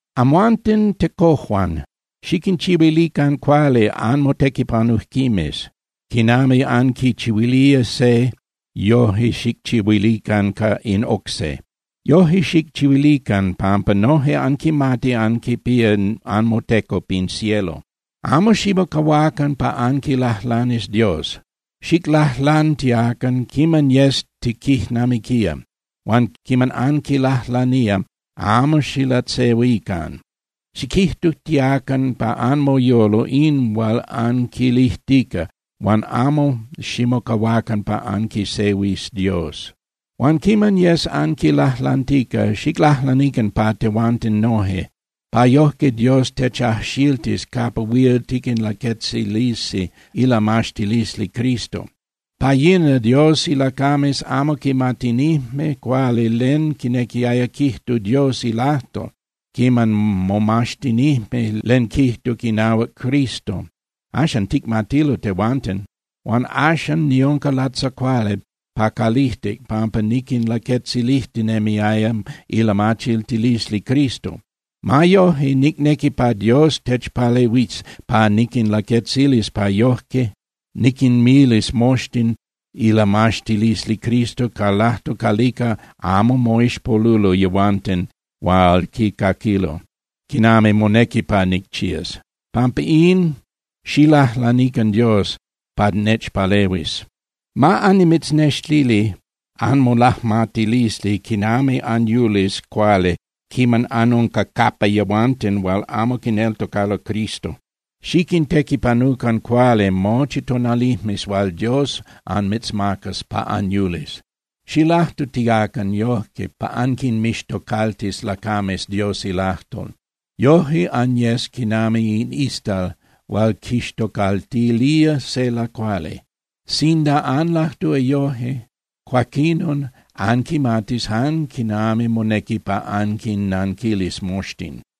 Amhuanten tecojuan, xiquinchihuilican cuali anmotequipanujquimes. Quinami anquichihuilía se, yoje xicchihuilican in oc se. Yoje xicchihuilican, pampa noje anquimati anquipía anmoteco pin cielo. Amo ximocahuacan pa anquilajlanis Dios. Xiclajlantiacan quiman yes tiquijnamiquía. Huan quiman anquilajlanía, amo xilatzehuican. Xiquijtutiacan pa anmoyolo in hual anquilijtica, huan amo ximocahuacan pa anquisehuis Dios. Huan quiman yes anquilajlantica, xiclajlanican pa tehuanten noje, pa yojque Dios techajxiltis capa huil tiquinlaquetzilisi ilamaxtilisli Cristo. Pa yina Dios ilacames amo quimatinijme cuali len quinequiaya quijtu Dios ilajtol quiman momaxtinijme len quijtuc inahuac Cristo. Axan ticmatilo tehuanten. Huan axan niunca latzacuali pa calijtic pampa niquinlaquetzilijtinemiaya ilamachiltilisli Cristo. Ma yoje, nicnequi pa Dios nechpalehuis pa niquinlaquetzilis pa yoje niquinmilis moxtin ilamaxtilisli Cristo ca lajtol calica amo moixpolulo yehuanten hual quicaquilo, quinami monequi pa nicchías. Pampa in, xiclajlanican Dios pa nechpalehuis. Ma anmitznextili anmolajmatilisli quinami anyulis cuali quiman anunca capa yehuanten hual amo quineltocalo Cristo. Xiquintequipanucan cuali mochi tonalijmes hual Dios anmitzmacas pa anyulis. Xilajtutiacan yoje pa anquinmixtocaltis lacames Dios ilajtol. Yoje anyes quinami in istal hual quixtocaltilía se lacuali. Sinda anlajtúa yoje, cuaquinon anquimatis jan quinami monequi pa anquinnanquilis moxtin.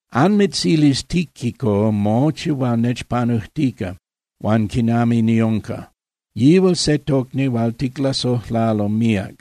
Anmitzilis Tíquico mochi hual nechpanujtica huan quinami niunca. Yihual se tocni hual ticlasojlalo míac,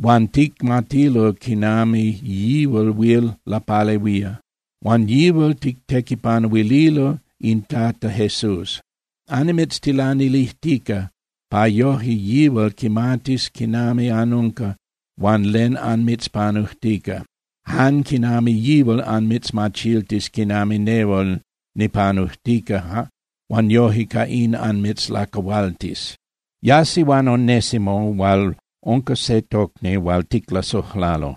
huan ticmatilo quinami yihual huil lapalehuía. Huan yihual tictequipanuililo in Tata Jesús. Annimitztilanilijtica pa yoje yihual quimatis quinami anunca huan len anmitzpanujtica, jan quinami yihual anmitzmachiltis quinami nehual nipanujtica huan yoje ca in anmitzlacahualtis. Yasi huan Onésimo hual unca se tocni hual ticlasojlalo,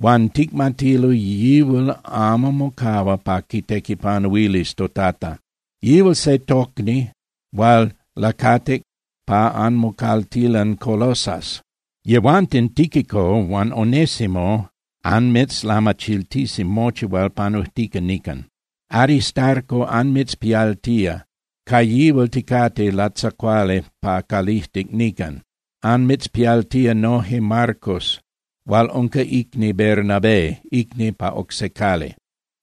huan ticmatilo yihual amo mocahua pa quitequipanuilis toTata. Yihual se tocni hual lacatic pa anmocaltilan Colosas. Yehuanten Tíquico huan Onésimo anmitzlamachiltisi mochi hual panujtica nican. Aristarco anmitzpialtía, ca yihual ticate latzacuali pa calijtic nican. Anmitzpialtía noje Marcos hual unca icni Bernabé, icni pa oc se cali.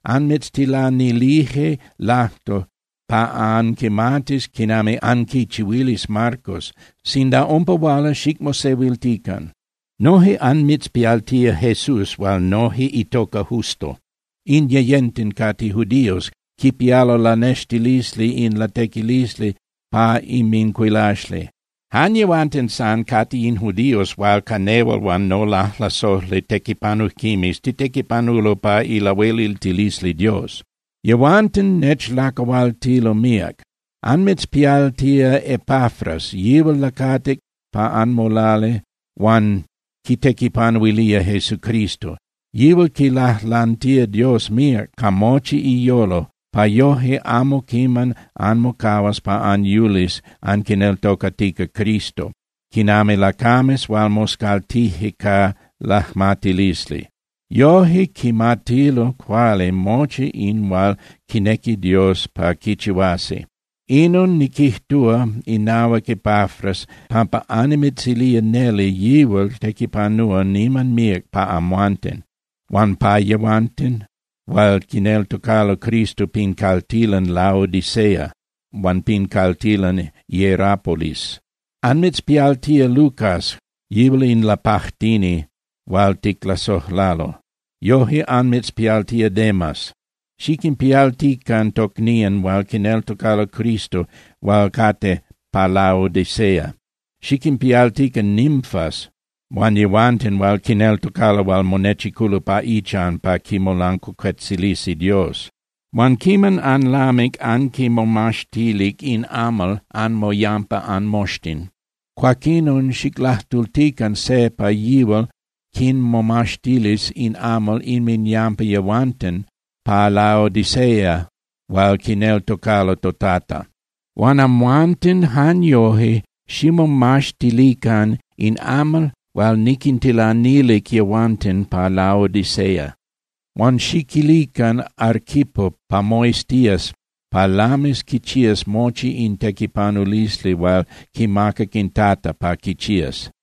Anmitztilanilije lajtol pa anquimatis quinami anquichihuilis Marcos, sinda umpa huala, xicmosehuiltican. Noje anmitzpialtía Jesús hual noje itoca Justo. In yeyenten cate judíos, quipialo ilanextilisli in latequilisli pa inmincuilaxli. Jan yehuanten san cate in judíos hual ca nehual huan nolajlasojli tequipanujquimes titequipanulo pa ilahueliltilisli Dios. Yehuanten nechlacahualtilo míac. Anmitzpialtía Epafras, yihual lacatic pa anmolali huan quitequipanuilía Jesucristo. Yihual quilajlantía Dios míac ca mochi iyolo, pa yoje amo quiman anmocahuas pa anyulis anquineltocatica Cristo, quinami lacames hual moscaltije ca lajmatilisli. Yoje quimatilo cuali mochi in hual quinequi Dios pa quichihuasi. Inon niquijtúa inahuac Epafras pampa annimitzilía neli yihual tequipanúa niman míac pa amhuanten huan pa yehuanten hual quineltocalo Cristo pin caltilan Laodicea huan pin caltilan Hierapolis. Anmitzpialtía Lucas, yihual in lapajtini hual ticlasojlalo, noje anmitzpialtía Demas. Xiquinpialtican tocnían hual quineltocalo Cristo hual cate pa Laodicea. Xiquinpialtican Nimfas huan yehuanten hual quineltocalo hual monechiculo pa ichan pa quimolancuacuetzilisi Dios. Huan quiman anlamic anquinmomaxtilic in amal anmoyampa anmoxtin, cuaquinon xiclajtultican se pa yihual quinmomaxtilis in amal inminyampa yehuanten pa Laodicea hual quineltocalo toTata. Huan amhuanten jan yoje ximomaxtilican in amal hual niquintilanilic yehuanten pa Laodicea. Huan xiquilican Arquipo pa moiztías pa lamis quichías mochi in tequipanulisli hual quimacac in Tata pa quichías.